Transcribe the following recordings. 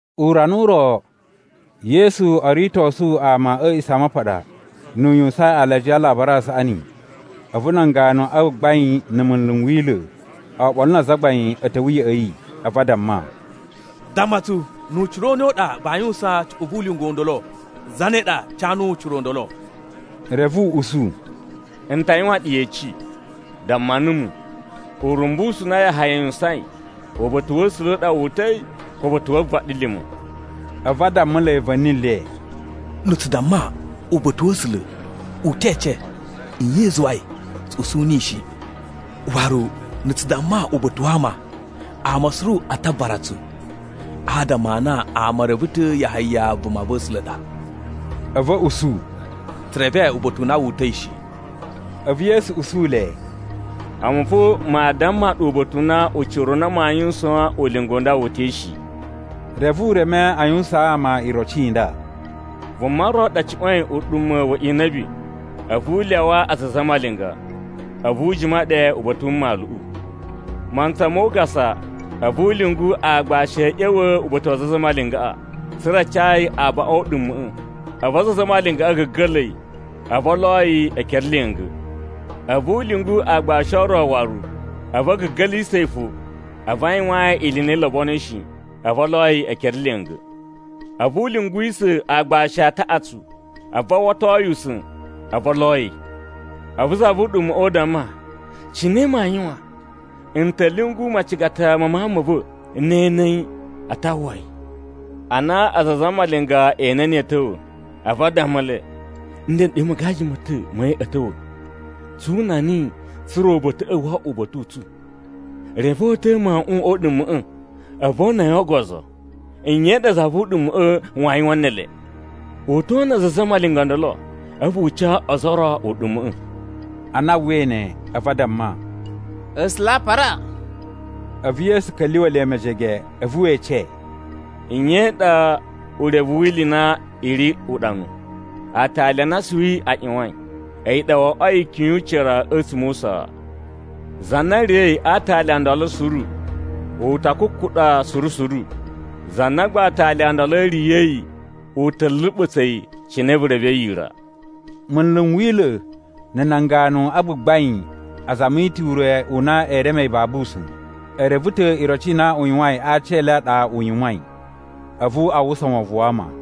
Urana u ro, Yesu o ritosu ama a̱ A̱a̱ꞌisamapaɗa, nu u yuwusain alajiya a Alabari a Saꞌani, a̱vu nan ganu a gbagbain, na̱ munlu n Wila̱, oɓolo na azagbain a̱ ta̱wa̱ ya̱ꞌa̱ yi. A̱vu a damma, “Damma tsu nu ucira u ne u ɗa vaa yuwusaan cuꞌun vu ulinga u ndolo. Zane ɗa ca nuwu ucira u ndolo?” Reve u usu, “N ta yuwan ɗu yeci. Damma numu, urumbusu u na Yahaya yuwusain, uba̱ta̱ wa̱ A̱sula̱ a ɗa wu uta̱i, ko uba̱ta̱ wu vaɗilima̱?” A̱vu a dammulai va̱ni le, “Na̱ tsu damma, ‘Uba̱ta̱ wa̱ A̱sula̱,’ u te ece, nye i zuwai tsu usu niyi shi? Waru na̱ tsu damma, ‘Uba̱ta̱ wa ama,’ ama suru a ta vuvara tsu, adama a na ama e reve ta̱ Yahaya vumava̱sula̱ ɗa.” A̱vu a̱ usu, “Tsu reve uba̱ta̱ u na wu uta̱i shi.” A̱vu Yesu usu le, “A̱mu fo maa damma ɗu uba̱ta̱ u na ucira u na maa yuwusaan ulinga u nda wu uta̱i shi.” Reve u reme a yuwusaan ama iroci i nda, “Vuma ro ɗa cuꞌwa̱in uɗuma̱ wa inabi, a̱vu u lyawaa aza a zamalinga, a̱vu u jima ɗe uba̱ta̱ wu mmaluꞌu. Mantsa mo ugasa, a̱vu u lyungu aagbashi a̱ ꞌya̱wa̱ uba̱ta̱ wa aza a zamalingaꞌa, tsa̱ra̱ a ca yi abaꞌun o uɗuma̱ꞌa̱. A̱vu aza a zamalinga a̱ ga̱ga̱la̱ yi, a̱vu o lo yi ekere lya̱nga̱. A̱vu u lyungu aagbashi o ro waru, a̱vu a̱ ga̱ga̱lisa̱ yi fo, a̱vu a yuwaan yi ili i na i lobonoi shi, a̱vu o lo yi ekere lya̱nga̱. A̱vu u lyunguwisa̱ aagbashi a taꞌatsu, a̱vu a uwwato yi usa̱n, a̱vu o lo yi. “A̱vu za vu uɗuma̱ꞌa̱ u damma, ‘Cine maa yuwan? N ta̱ lyungu macigata ma mawun ma̱ va̱. Ne e ene yi a ta uwwa yi.’ “Ana aza a zamalinga e ene niyi a̱ ta̱wa̱, a̱vu a dammulai, ‘Ndeɗe magaji ma̱ ta̱ ma̱ yi a̱ ta̱wa̱. Tsu una niyi, tsa̱ra̱ uba̱ta̱ꞌa̱ wo oꞌwo uba̱ta̱ u tsu.’ Reve o uta̱a̱ mawuꞌun o uɗuma̱ꞌa̱, a̱vu o una yi o ogozo. “Nye za vu uɗuma̱ꞌa̱ waa yuwan ne ele? U to una aza a zamalinga o ndolo, a̱vu u ca ozo o ro uɗuma̱ꞌa̱.” Ana a uwwai ne, a̱vu a damma, “A̱sula̱ a para!” A̱vu Yesu ka̱lyuwa̱ le mejege, a̱vu we ece, “Nye i ɗa urevu wi ili i na i ri uɗanu: ‘Aatali a na asuwi a ꞌyuwain, a̱yi ɗa wo oꞌwoi ikyun yu ucira a̱tsuma̱ o usaa.’ Za na riya̱i a aatali o ndolo suru, u ta kukuɗa suru suru. Za na gba aatali o ndolo a̱ riya̱yi u ta̱ luɓa̱tsa̱ yi cine vu revei yira.” Munlu n Wila̱ na̱ nan ganu a gbagbain a zami ta̱ ure u na ee reme yi babu usa̱n, e reve ta̱ iroci i na u yuwain a aciyele a ɗa u yuwain. A̱vu a uwwusa wovon wa ama.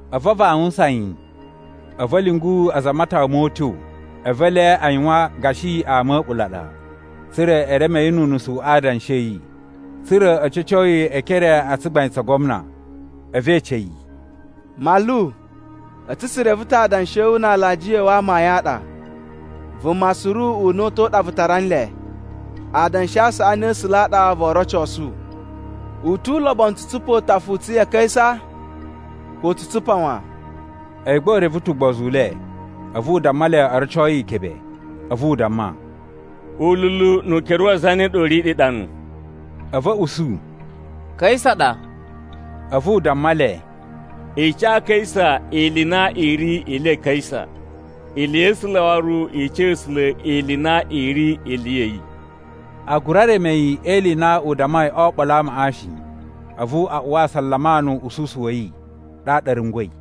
A̱vu a vawusan yi, a̱vu a̱ lyungu aza a matawa mo utyo. A̱vu ele a yuwan gashi ama a̱ a̱ɓula̱ a ɗa, tsa̱ra̱ e reme yi nu unusu a adanshi a̱ yi, tsa̱ra̱ a̱ ca̱co yi e ekere a tsugbain tsa gwamna. A̱vu e ece yi, “Manlu, a̱tsu tsu reve ta̱ adanshi a̱ wu na alajiya a̱ wu amayun a ɗa. Vuma suru una̱ta̱ u ɗa vu tara nle. Adanshi a saꞌani a̱ A̱sula̱ a ɗa voo rocosu. U tu ulobonu tsu tsupa utafa u tsu ya Kaisa, ko tsu tsupa wan?” A̱yi gba u reve ta̱ ugbozu u le, a̱vu u damma le o roco yi ikebe. A̱vu u damma, “Ululu nu ukere wa zane ɗa u ri ɗe uɗanu?” A̱vu a̱ usu, “Kaisa ɗa.” A̱vu u damma le, “I ca Kaisa ili i na i ri ili ya Kaisa, ili ya̱ A̱sula̱ waru i ca A̱sula̱ ili i na i ri ili ya̱ yi.” A gura reme yi e ili i na u dammai o oɓolo a amaꞌa shi. A̱vu a uwa asalama nu uꞌususu wa̱ yi, ɗaɗa a̱ rungwa̱i.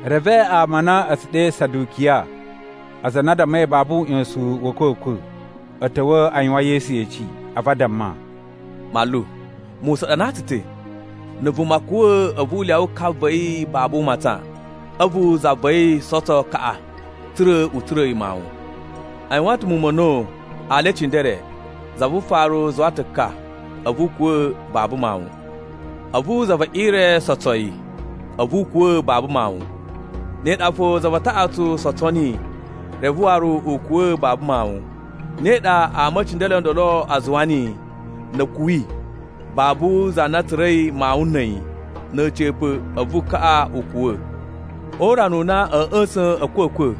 Reve ama a na a̱ tsu ɗe Sadukiya (aza a na a dammai babu uꞌyosun wa̱ a̱kwa̱kwa̱), a̱ ta̱wa̱ a yuwan Yesu yeci. A̱vu a damma, “Manlu, Musa ɗanaa tsu ta̱, ‘Na̱ vuma kuwa̱, a̱vu u lyawa ka va̱ yi babu u matsan. A̱vu za va̱ yi sotso kaꞌa, tsa̱ra̱ u tsura̱a̱ yi mawun.’ A yuwan ta̱ muwun ma̱ a̱na̱wu, ali e cindere. Za vu ufaru zuwa ta̱ ka, a̱vu u kuwa̱ babu mawun. A̱vu za ve ire sotso yi, a̱vu u kuwa̱ babu mawun. Ne ɗa fo, za va taꞌatsu sotso niyi, reve waru u kuwa̱ babu mawun. Ne ɗa ama e cindere o ndolo a zuwa niyi, na̱ a̱ kuwi, babu za na tsura̱i mawun na̱ a̱yi. Na̱ a̱ca̱pa̱, a̱vu kaꞌa u kuwa̱. O urana u na a̱a̱ ꞌya̱sa̱n a̱kwa̱kwa̱,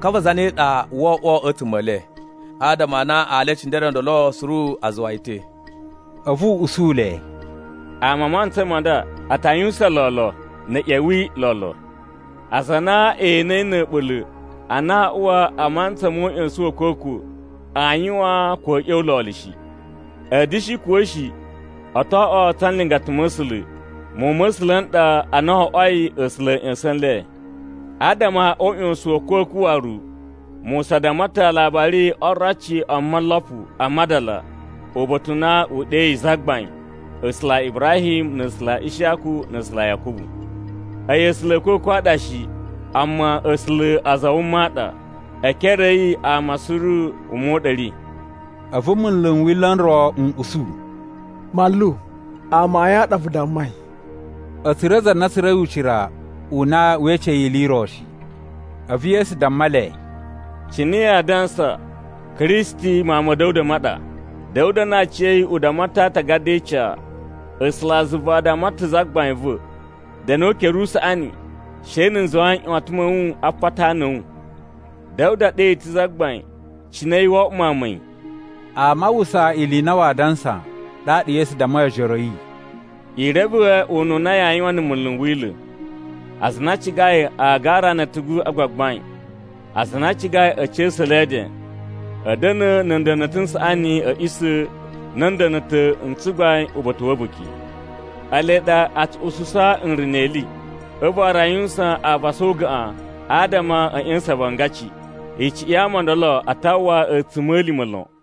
ka va zane ɗa woo oꞌwo a̱tsuma̱ e le? Adama a na ali e cindere o ndolo suru a zuwa yi ta̱.” A̱vu u usu le, “Ama a mantsa ma nda, a ta yuwusan lolo na̱ a̱ ꞌya̱wi lolo. Aza a na e enei na̱ a̱ɓula̱ a na aa uwa a mantsa nu uꞌyosun wa̱ a̱kwa̱kwa̱, aa yuwan ko a̱ ꞌya̱wa̱ lolo shi. A̱ da̱shi kuwa̱ shi, o to oꞌwo tsa nlingata ma̱ A̱sula̱. Muwun ma̱ A̱sula̱ n ɗa ana wo oꞌwoi A̱sula̱ a̱ ꞌya̱sa̱n nle. Adama o uꞌyosun wa̱ a̱kwa̱kwa̱ waru, Musa damma ta̱ a aalabari o oroci o molopu a madala uba̱ta̱ u na u ɗeyi Zagbain, ‘A̱sula̱ a Ibrahim, na̱ A̱sula̱ a Ishiyaku, na̱ A̱sula̱ a Yakubu.’ A̱yi A̱sula̱ a̱ a̱kwa̱kwa̱ a ɗa shi, amma A̱sula̱ a aza a wuma a ɗa, e ekere a̱ yi ama suru wuma u ɗa a̱ ri.” A̱vu munlu n Wila̱ n ro n usu, “Manlu, amayun a ɗa vu dammai!” A̱ tsura̱ za na tsura̱i ucira u na wee ece yi ili i ro shi. A̱vu Yesu damma le, “Cine yaa dansa Kristi Mawun ma̱ Da̱wuda ma ɗa? Da̱wuda na aciya̱yi u damma ta̱ a Aatagada e Ica: ‘A̱sulazuva a damma ta̱ Zagbain va̱, “Da̱nu o ukere u usaꞌani, she na̱ n zuwa nꞌyuwatan ma̱ wu a apata a ana a̱ wu.” ’ Da̱wuda ɗe yi ta̱ ‘Zagbain.’ Cine a̱yi woo oꞌwo mawun ma̱ yi?” Ama a uwwusa ili i na waa dansa, ɗaɗa Yesu dammai ojoro a̱ yi, “I reve ununa yaa yuwan na̱ munlu n Wila̱. Aza a na a cigai agara na̱ a̱tugu a gbagbain, aza a na a cigai a̱ ca̱sa̱ le e eden, a̱ da̱na̱ na̱ nda̱na̱ta̱ n saꞌani a̱ a̱ꞌisa̱ na̱ nda̱na̱ta̱ n tsugbain uba̱ta̱ wa̱ a̱buki. Ele ɗa a tsu ususa nruna̱ ili. A̱vu waru a yuwusan avasa o ugaꞌan adama a̱ ꞌya̱sa̱n avangaci. Icuꞌun ya ama o ndolo a ta uwwa a̱tsuma̱lima̱ lon.”